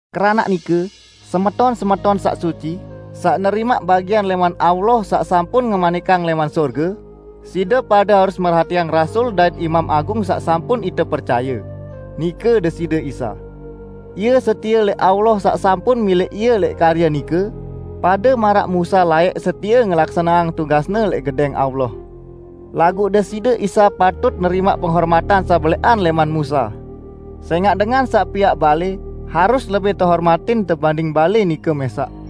Keranaq nike, semeton-semeton saq suci, saq nerimaq bagian lẽman Allah saq sampun ngemanikang lẽman sorge, side pade harus merhatiang Rasul dait Imam Agung saq sampun ite percaye, nike Deside Isa. Ie setie lẽq Allah saq sampun milẽq Ie lẽq karye nike, pade maraq Musa laẽq setie ngelaksaneang tugasne lẽq Gedẽng Allah. Laguq Deside Isa patut nerimaq penghormatan saq belẽqan lẽman Musa. Sẽngaq dengan saq piaq balẽ harus lebih tehormatin tebanding balẽ nike mẽsaq.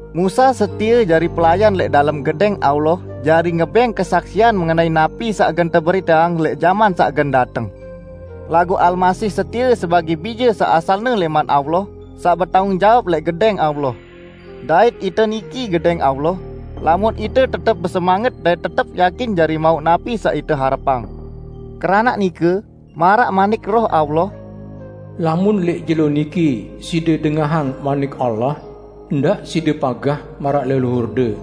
Musa setie jari pelayan lẽq dalem gedẽng Allah jari ngebẽng kesaksian mengenai napi saq gen teberiteang lẽq jaman saq gen dateng. Laguq Almasih setie sebagẽ Bije saq asalne lẽman Allah saq betanggung jawab lẽq gedẽng Allah. Dait ite niki gedẽng Allah, lamun ite tetep besemanget dait tetep yakin jari mauq napi saq ite harepang. Keranaq nike, maraq manik Roh Allah, "Lamun lẽq jelo niki side dengahang Manik Allah, ndaq side pagah maraq leluhurde,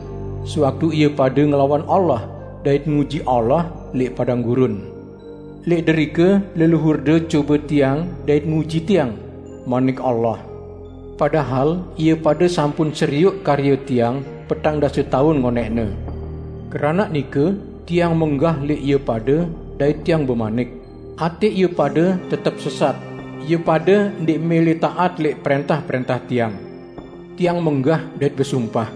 sewaktu ie pade ngelawan Allah, dait nguji Allah lẽq padang gurun. 'Lẽq derike leluhurde cobe Tiang dait nguji Tiang,' Manik Allah, 'Padahal ie pade sampun serioq karye Tiang petang dase taun ngonẽqne.' Keranaq nike Tiang menggah lẽq ie pade dait Tiang bemanik, 'Atẽ ie pade tetep sesat, ie pade ndẽq mẽlẽ taat lẽq prẽntah-prẽntah Tiang.' Tiang menggah dait besumpah,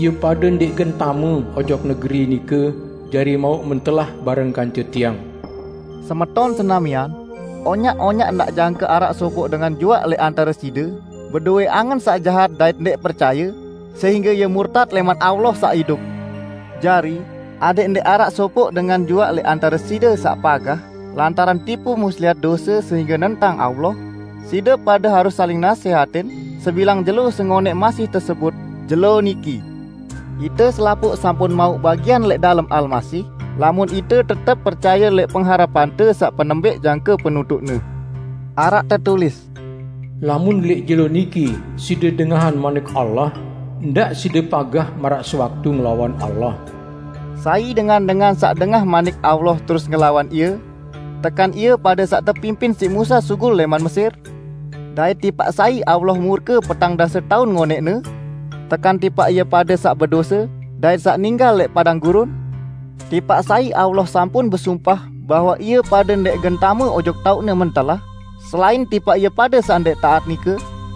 'Ie pade ndẽq gen tame ojok negeri nike jari mauq mentelah bareng kance Tiang.' " Semeton senamian, onyaq-onyaq ndaq jangke araq sopoq dengan juaq lẽq antare side bedowẽ angen saq jahat dait ndẽq percaye, sehingge ie murtat lẽman Allah saq idup! Jari, adẽq ndẽq araq sopoq dengan juaq lẽq antare side saq pagah lantaran tipu muslihat dose sehingge nentang Allah, side pade harus saling nasẽhatin sebilang jelo sengonẽq masih tesebut "Jelo Niki". Ite selapuq sampun mauq bagian lẽq dalem Almasih lamun ite tetep percaye lẽq pengharepante saq penembẽq jangke penutuqne. Araq tetulis, "Lamun lẽq jelo niki side dengahang Manik Allah, ndaq side pagah maraq sewaktu ngelawan Allah." Sai dengan-dengan saq dengah Manik Allah terus ngelawan Ie? Tekan ie pade saq tepimpin siq Musa sugul lẽman Mesir? Dait tipaq sai Allah murke petang dase taun ngonẽqne? Tekan tipaq ie pade saq bedose, dait saq ninggal lẽq padang gurun? Tipaq sai Allah sampun besumpah bahwe ie pade ndẽq gen tame ojok taoq-Ne mentelah, selain tipaq ie pade saq ndẽq taat nike?